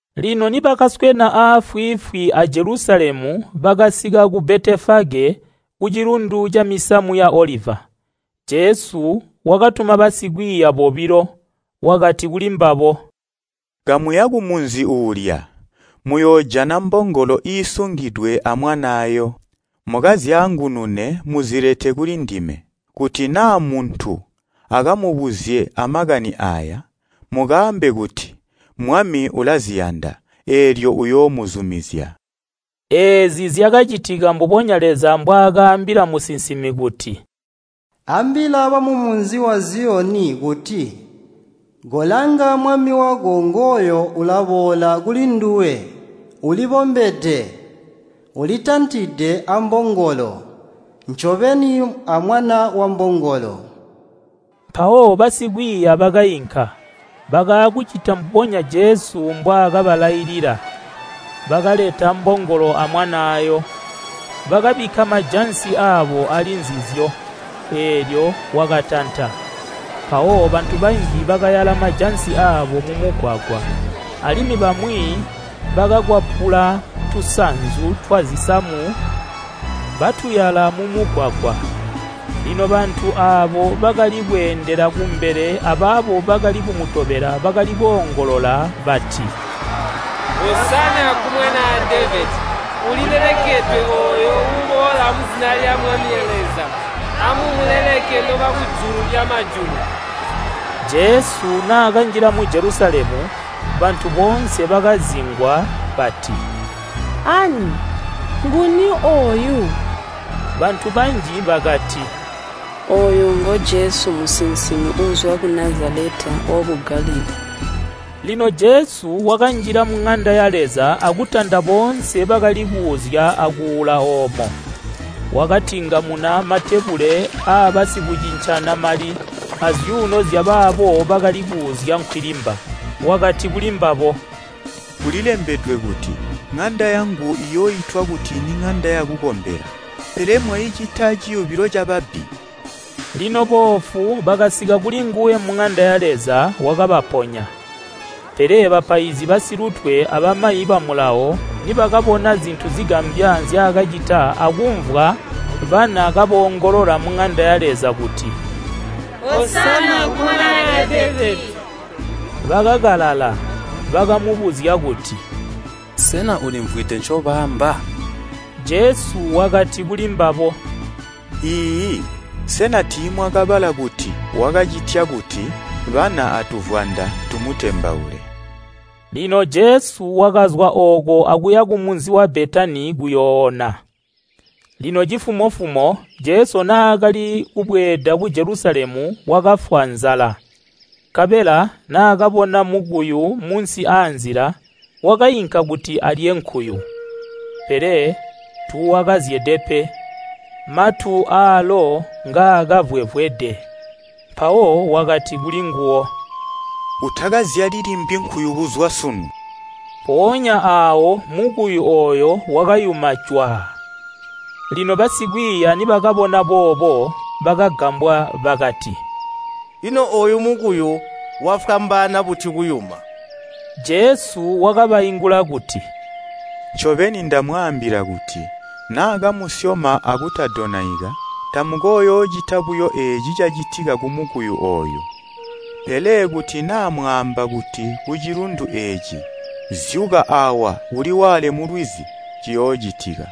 Lino nibakaswena aafwiifwi a Jelusalemu bakasika ku Betefage ku Cilundu camisamu ya Oliva. Jesu wakatuma basikwiiya bobilo, wakati kulimbabo, “Kamuya kumunzi uulya, muyoojana mbongolo iisungidwe amwanaayo. Mukazyaangunune muzilete kulindime. Kuti naa muntu akamubuzye amakani aaya, mukaambe kuti, ‘Mwami ulaziyanda.’ Eelyo uyoomuzumizya.” Eezi zyakacitika mbubonya Leza mbwaakaambila musinsimi kuti, “Ambila bamumunzi wa Ziyoni kuti, ‘Kolanga mwami wako ngooyo ulaboola kulinduwe. Ulibombede, ulitantide ambongolo, ncobeni, amwana wambongolo.’” Mpawo basikwiiya bakainka, bakaakucita mbubonya Jesu mbwaakabalailila. Bakaleta mbongolo amwanaayo, bakabikka majansi aabo ali nzizyo, eelyo wakatanta. Mpawo bantu banji bakayala majansi aabo mumugwagwa, alimwi bamwi bakakwapula tusanzu twazisamu batuyala mumugwagwa. Lino bantu aabo bakali kweendela kumbele abaabo bakali kumutobela bakali koongolola bati, “Alemekwe Mwanaa Devedi! Ulilelekedwe ooyo uuboola muzina lya Mwami Leza! Amumulemeke nobakujulu lyamajulu!” Jesu naakanjila mu Jelusalemu, bantu boonse bakazingwa bati, “Ani nguni ooyu?” Bantu banji bakati, “Ooyu ngo Jesu musinsimi uuzwa ku Nazaleta waku Galilii.” Lino Jesu wakanjila muŋanda ya Leza akutanda boonse bakali kuuzya akuula oomo. Wakatingamuna matebule aabasikucincana mali azyuuno zyabaabo bakali kuuzya nkwilimba. Wakati kuli mbabo, “Kulilembedwe kuti, ‘ŋanda yangu iyooitwa kuti niŋanda yakukombela,’ pele mwaicita ciyubilo cababbi.” Lino boofu bakasika kulinguwe muŋanda ya Leza wakabaponya. Pele bapaizi basilutwe abamayi ba Mulawo nibakabona zintu zigambya nzyaakacita akumvwa bana kaboongolola muŋanda ya Leza kuti, “Alemekwe Mwanaa Devedi!” Bakakalala. Bakamubuzya kuti, “Sena ulimvwide ncobaamba?” Jesu wakati kulimbabo, “Iiyi, sena tiimwakabala kuti, ‘Wakacitya kuti bana atuvwanda tumutembaule.’” Lino Jesu wakazwa ooko akuya kumunzi wa Betani kuyooona. Lino cifumo-fumo Jesu naakali kubweeda ku Jelusalemu wakafwa nzala. Nkabela naakabona mukuyu munsi aanzila, wakainka kuti alye nkuyu. Pele tuuwakazyede pe, matu aalo ngaakavwevwede. Mpawo wakati kulinguwo, “Utakazyali limbi nkuyu kuzwa sunu!” Mpoonya aawo mukuyu ooyo wakayuma cwaa. Lino basikwiiya nibakabona boobo, bakagambwa bakati, “Ino ooyu mukuyu wafwambaana buti kuyuma?” Jesu wakabaingula kuti, “Ncobeni, ndamwaambila kuti naa kamusyoma akutadonaika, tamukooyoocita buyo eeci cacitika kumukuyu ooyu, pele kuti naa mwaamba kuti kucilundu eeci, ‘Zyuka aawa uliwaale mulwizi,’ ciyoocitika.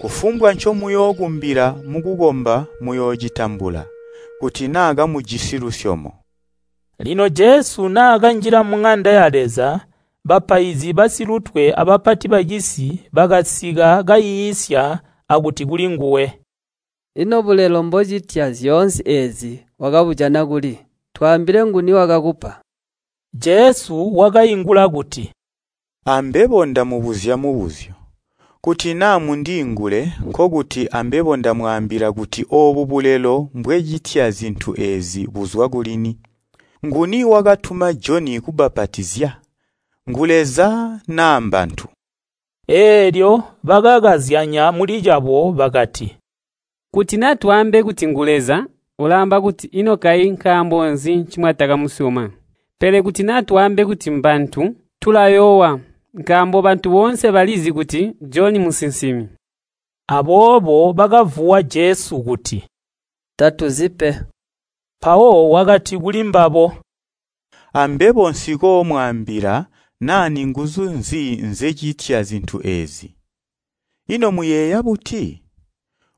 Kufumbwa ncomuyookumbila mukukomba muyoocitambula, kuti naa kamujisi lusyomo.” Lino Jesu naakanjila muŋanda ya Leza, bapaizi basilutwe abapati bacisi bakasika kaiisya akuti kulinguwe, “Ino bulelo mbocitya zyoonse eezi wakabujana kuli? Twaambile nguni wakakupa?” Jesu wakaingula kuti, “Ambebo ndamubuzya mubuzyo. Kuti naa mundiingule nkokuti ambebo ndamwaambila kuti oobu bulelo mbwecitya zintu eezi buzwa kulini. Nguni wakatuma Joni kubbapatizya. Ngu Leza naa mbantu?” Eelyo bakakazyanya mulicabo bakati, “Kuti naa twaambe kuti, ‘Ngu Leza,’ ulaamba kuti, ‘Ino kayi nkaambo nzi ncimwatakamusyoma?’ Pele kuti naa twaambe kuti ‘Mbantu,’ tulayoowa, nkaambo bantu boonse balizi kuti Joni musinsimi.” Aboobo bakavuwa Jesu kuti, “Tatuzi pe.” Mpawo wakati kulimbabo, “Ambebo nsikoomwaambila naa ninguzu nzi nzecitya zintu eezi. “Ino muyeeya buti?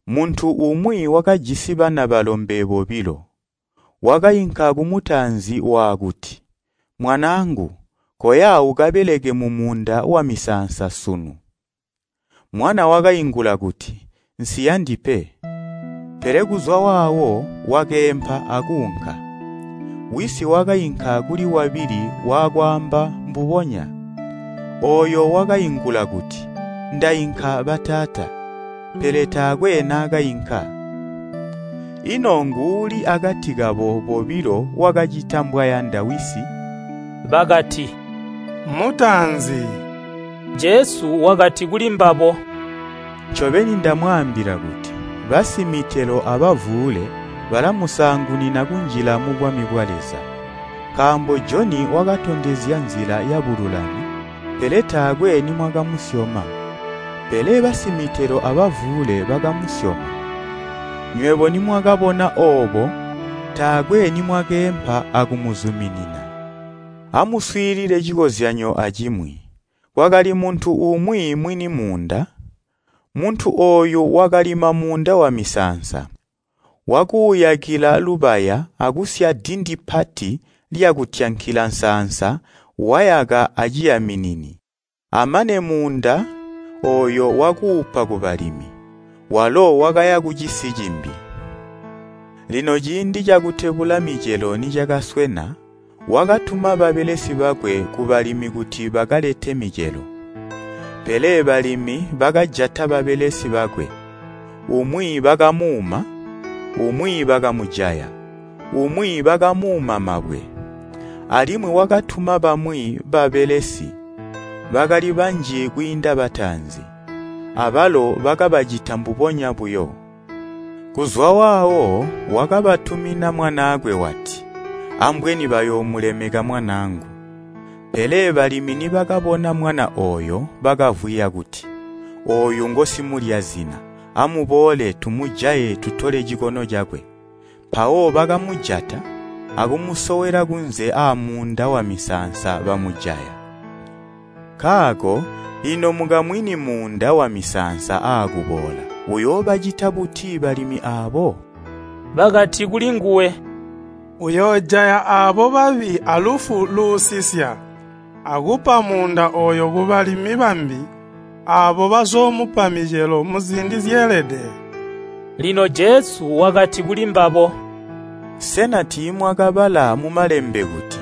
Muntu umwi wakajisi bana balombe bobilo, wakainka kumutaanzi waakuti, ‘Mwanaangu, koya ukabeleke mumuunda wamisaansa sunu.’ Mwana wakaingula kuti, ‘Nsiyandi pe.’ Pele kuzwa waawo wakeempa akuunka. Wisi wakainka kuli wabili wakwaamba mbubonya. Ooyo wakaingula kuti, ‘Ndainka bataata,’ pele taakwe naakainka. Ino nguuli akati kabo bobilo wakacita mbwayanda wisi?” Bakati, “Mutaanzi.” Jesu wakati kulimbabo, “Ncobeni ndamwaambila kuti, basimitelo abavuule balamusaangunina kunjila mubwami bwa Leza. Nkaambo Joni wakatondezya nzila yabululami, pele taakwe nimwakamusyoma. Pele basimitelo abavuule bakamusyoma, nywebo nimwakabona oobo taakwe nimwakeempa akumuzuminina. “Amuswiilile cikozyanyo acimwi. Kwakali muntu umwi mwini muunda. Muntu ooyu wakalima muunda wamisaansa. Wakuuyakila lubaya akusya dindi pati lyakutyankila nsaansa wayaka ngazi. Amane muunda ooyo wakuupa kubalimi, walo wakaya kucisi cimbi. Lino ciindi cakutebula micelo nicakaswena, wakatuma babelesi bakwe kubalimi kuti bakalete micelo. Pele balimi bakajata babelesi bakwe, umwi bakamuuma, umwi bakamujaya, umwi bakamuuma mabwe. Alimwi wakatuma bamwi babelesi, bakali banji kwiinda bataanzi, abalo bakabacita mbubonya buyo. Kuzwa waawo wakabatumina mwanaakwe wati, ‘Ambweni bayoomulemeka mwanaangu.’ Pele balimi nibakabona mwana ooyo bakavwiya kuti, ‘Ooyu ngosimulya zina. Amuboole, tumujaye tutole cikono cakwe.’ Mpawo bakamujaya, akumusowela kunze aamuunda wamisaansa bamujaya. Nkaako ino mukamwini muunda wamisaansa aakuboola, uyoobacita buti balimi aabo?” Bakati kulinguwe, “Uyoojaya aabo babi alufu luusisya, akupa muunda ooyo kubalimi bambi. Aabo bazoomupa micelo muziindi zyeelede.” Lino Jesu wakati kulimbabo, “Sena tiimwakabala mu Malembe kuti: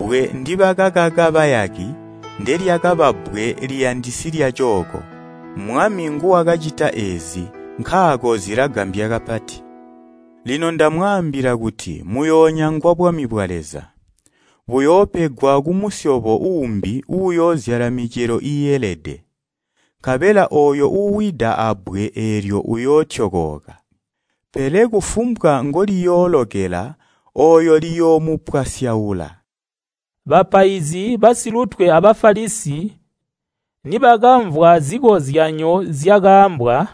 ‘Bbwe ndibakakaka bayaki ndelyakaba bbwe liyandisi lyacooko. Mwami nguwakacita eezi, nkaako zilagambya kapati.’ “Lino ndamwaambila kuti muyoonyangwa bwami bwa Leza. Buyoopegwa kumusyobo uumbi uuyoozyala micelo iielede. Nkabela ooyo uuwida abbwe eelyo uyootyokooka, pele kufumbwa ngoliyoolokela ooyo liyoomupwasyaula.” Bapaizi basilutwe a Bafalisi nibakamvwa zikozyanyo zyakaambwa,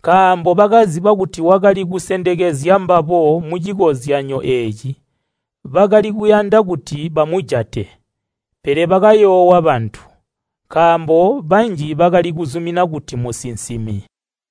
nkaambo bakaziba kuti wakali kusendekezya mbabo mucikozyanyo eeci. Bakali kuyanda kuti bamujate. Pele bakayoowa bantu, nkaambo banji bakali kuzumina kuti musinsimi.